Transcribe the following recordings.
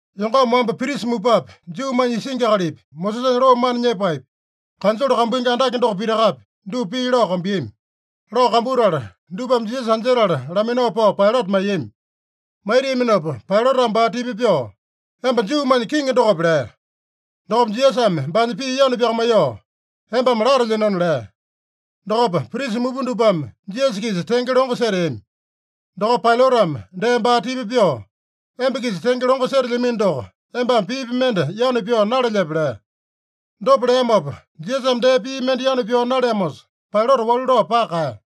Yongama wamba, prisa mupapi, Juumanya isingi akalipi, Mosesanya loo mana nyepaepi, kanjole kambuingi andake doko pitakapi, dupa pii lao kambuiyami. Lao kambutala, dupame Jisasa anjetala laminao pao Pailata maiyami. Maitiaminopa Pailatame baa tipa pyoo, “Emba Juumanya Kiŋi dokope?” lea. Dokopa Jisasame baanya pii yanu pyakamaiyoo, “Embame latelyenona” lea. Dokopa prisa mupa dupame Jisasa-kisa tenge longo seteami. Dokopa Pailatame dee baa tipa pyoo, “Emba-kisa tenge longo setelyamino doko, embame piipi mende yanu pyao nalelyepe?” lea. Dopa leamopa, Jisasame dee pii mende yanu pyao naleamosa, Pailata walu lao paka kaeya.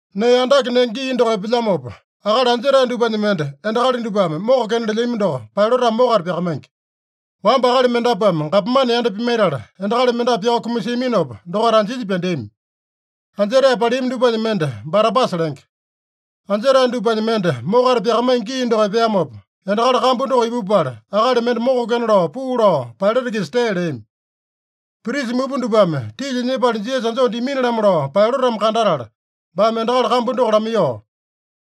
Nee andake nenge gii doko epelyamopa akali anjetae dupanya mende endakali dupame mokokena lelyami doko Pailatame mokata pyakamaingi. Wamba akali mendapuame gapomane yanda pimaitala, endakali mendapu pyao kumasiaminopa, dokaita anjinya pyandeami. Anjetae paleami dupanya mende Barabasa lenge. Anjetae dupanya mende mokata pyakamaingi gii doko epeamopa, endakali kambu doko ipupala, akali mende mokokena lao puu lao Pailata-kisa tee leami. Prisa mupa dupame tilya nyepala Jisasa anjoo dimini-lamo lao Pailatame kandatala, baame endakali kambu doko lamaiyoo,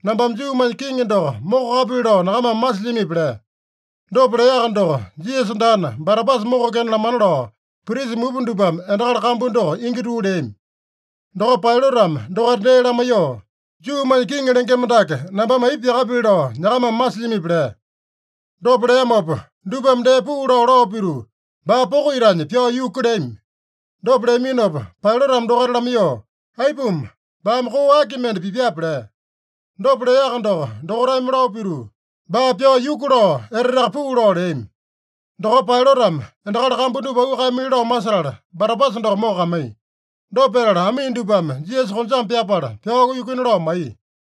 “Nambame Juumanya Kiŋi doko mokokapili lao nyakamame masilyamipi?” lea. Dopa leaka doko, Jisasa daana, Barabasa mokokena lamana lao, prisa mupa dupame endakali kambu doko ingi tuu leami. Dokopa Pailatame dokaita dee lamaiyoo, “Juumanya Kiŋi lengema dake nambame aipa pyakapili lao nyakamame masilyamipi?” lea. Dopa leamopa dupame dee puu lao, lao pituu, “Baa poko itanya pyao yuku!” leami. Dopa leaminopa Pailatame dokaita lamaiyoo, “Aipuma? Baame koo aki mende pipyape?” lea. Dopa leaka doko dokaitame lao pituu, “Baa pyao yuku!” lao eteteaka puu lao leami. Dokopa Pailatame endakali kambu dupa auu kaeyamili lao masetala, Barabasa doko mokokamaiya. Dopa petala amii dupame Jisasa konjame pyapala pyao yukuina lao maiya.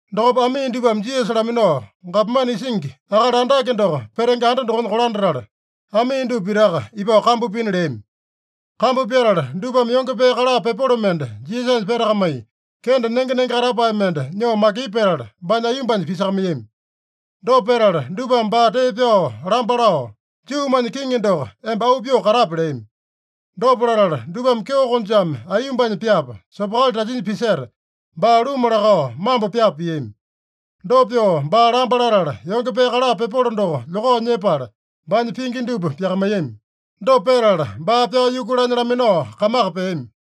Dokopa amii dupame Jisasa laminao, gapomane isingi akali andake doko petenge anda dokonya kolandatala, amii dupa pitaka ipao kambu pina leami. Kambu pyatala, dupame yonge pee kala pepolo mende Jisasanya petakamai, kende nenge-nenge katapae mende nyoo makipu petala, baanya aiyombanya pisakamaiyami. Dopa petala dupame baa tee pyao lamba lao, “Juumanya Kiŋi doko, emba auu pyoo katape!” leami. Dopa latala dupame kyeo konjame aiyombanya pyapa, sopokali tasinya piseta, baa luma lakao mambo pyapa piami. Dopa pyoo baa lamba latala, yonge pee kala pepolo doko lyokao nyepala, baanya pingi dupa pyakamaiyami. Dopa petala, baa pyao yukulanya laminao kamaka peami.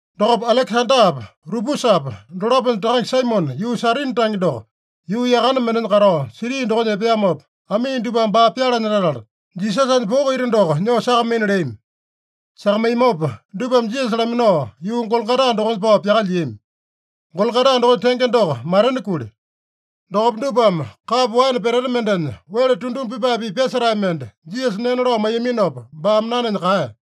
Dokopa Alekesandapa, Rupusapa dolaponya takange Saimone, yuu Sairini tange doko, yuu yakane mendenya katao siti dokonya epeamopa, amii dupame baa pyalanya latala, Jisasanya poko ita doko nyoo sakamaina leami. Sakamaiyamopa dupame Jisasa laminao, yuu Gologota dokonya pao pyakalyiami. (Gologota dokonya tenge doko, Matena Kuli.) Dokopa dupame kapo waene peteta mendenya wele tunduma pipae-pipa pyasetae mende Jisasa nena lao maiyaminopa, baame nanenya kaeya.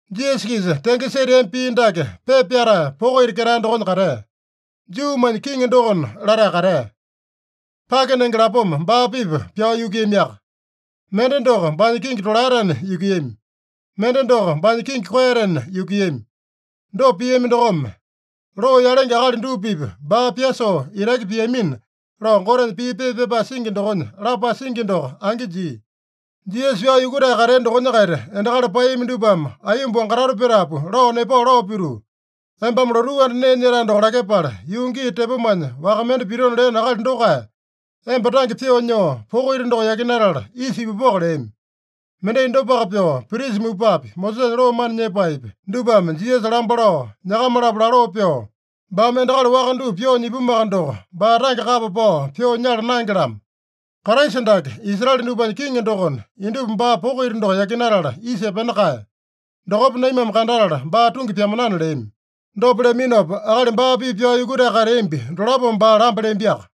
Jisasa-kisa tenge seteami pii dake pepa pyatae poko ita ketae dokonya katea: “Juumanya Kiŋi dokona” latae katea. Pake nenge lapoma baa-pipa pyao yukuiyamiaka. Mende doko baanya kingi tolaetena yukuiyami. Mende doko baanya kingi koeyatena yukuiyami. Dopa piami dokome, “Loo yalenge akali dupa-pipa baa pyasoo itaki piamina” lao Gotenya pii pepa pyapae singi dokonya lapae singi doko angi jia. Jisasa pyao yukutae katea dokonya-kaita endakali paeyami dupame aiyomba wangatoto petapu lao nepao lao pituu, “Embame lotuu anda nee nyetae doko lakyepala, yuu gii tepomanya waka mende pitona leeno akali dokae, emba tange pyoo nyoo, poko ita doko yakinatala isa ipupoko” leami. Mendai dopaka pyoo, prisa mupapi, Mosesanya loo mana nyepaepi, dupame Jisasa lamba lao, nyakama-lapo laloo pyoo, “Baame endakali waka dupa pyoo nyipumuaka doko, baa tange kapa pao pyoo nyala naenge-lamo. Kraisa dake, Israele dupanya Kiŋi dokona, indupa baa poko ita doko yakinatala isa epena kae. Dokopa naimame kandatala baa tungi pyamanana” leami. Dopa leaminopa, akali baa-pipa pyao yukutae kateambi dolapome baa lamba leambiaka.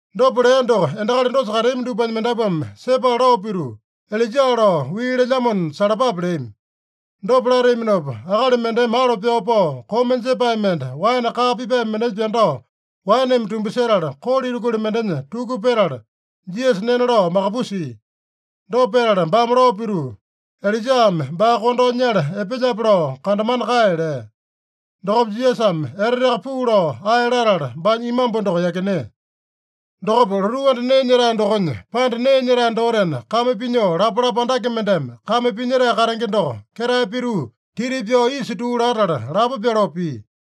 Dopa lea doko endakali dosa kateami dupanya mendapuame sepala lao pituu, “Ilaija lao wii lelyamona salapape” leami. Dopa lateaminopa, akali mendeme alo pyao pao, koma jepae mende waene kaa pipae mendenya pyandao waeneme tumbasetala, kolo itakuli mendenya tuku petala, Jisasa nena lao makapusia. Dopa petala baame lao pituu, “Ilaijame baa kondao nyala epelyape lao kandamana kae” lea. Dokopa Jisasame eteteaka puu lao ae latala, baanya imambu doko yakinea. Dokopa lotuu anda nee nyetae dokonya panda nee nyetae dotena kame pinyoo lapalapa andake mendeme kame pinyetae katenge doko ketae pituu titi pyao isa tuu latala lapo pyoloo pia.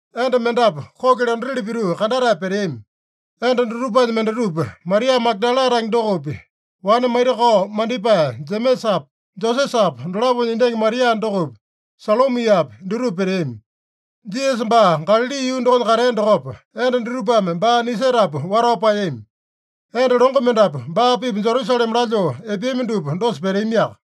Enda mendapu kuki londatili pituu kandatae peteami. Enda dutupanya mendatupa, Maria Magadala tange dokopi, wane maitakao mandipae Jemesapa, Josesapa dolaponya endangi Maria dokopi, Salomiapi, dutupa peteami. Jisasa baa Galali yuu dokonya katea dokopa, enda dutupame baa nisetapu watao paeyami. Enda longo mendapu baa-pipa Jerusalema lalyoo epeami dupa dosa peteamiaka.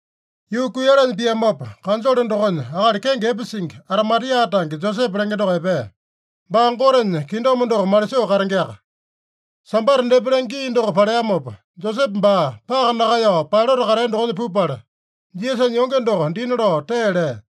Yuu kuiyalanya piamopa, kanjole dokonya akali kenge epe singi, Arimatia tange Josepe lenge doko epea. Baa Gotenya kingdom doko malisoo katengeaka. Sambata depa lenge gii doko paleamopa, Josepe baa paka nakaeyao, Pailata katea dokonya pupala, Jisasanya yonge doko dina lao tee lea.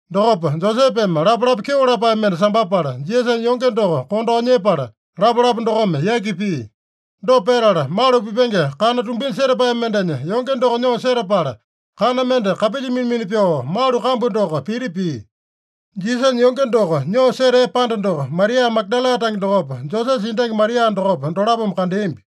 Dokopa Josepeme lapalapa kyeo lapae mende sambapala, Jisasanya yonge doko kondao nyepala, lapalapa dokome yaki pia. Dopa petala, malu pipenge kana tumbinya setapae mendenya yonge doko nyoo setapala, kana mende kapilya mina-mina pyoo malu kambu doko piti pia. Jisasanya yonge doko nyoo setea panda doko Maria Magadala tange dokopa, Josesa endangi Maria dokopa, dolapome kandeambi.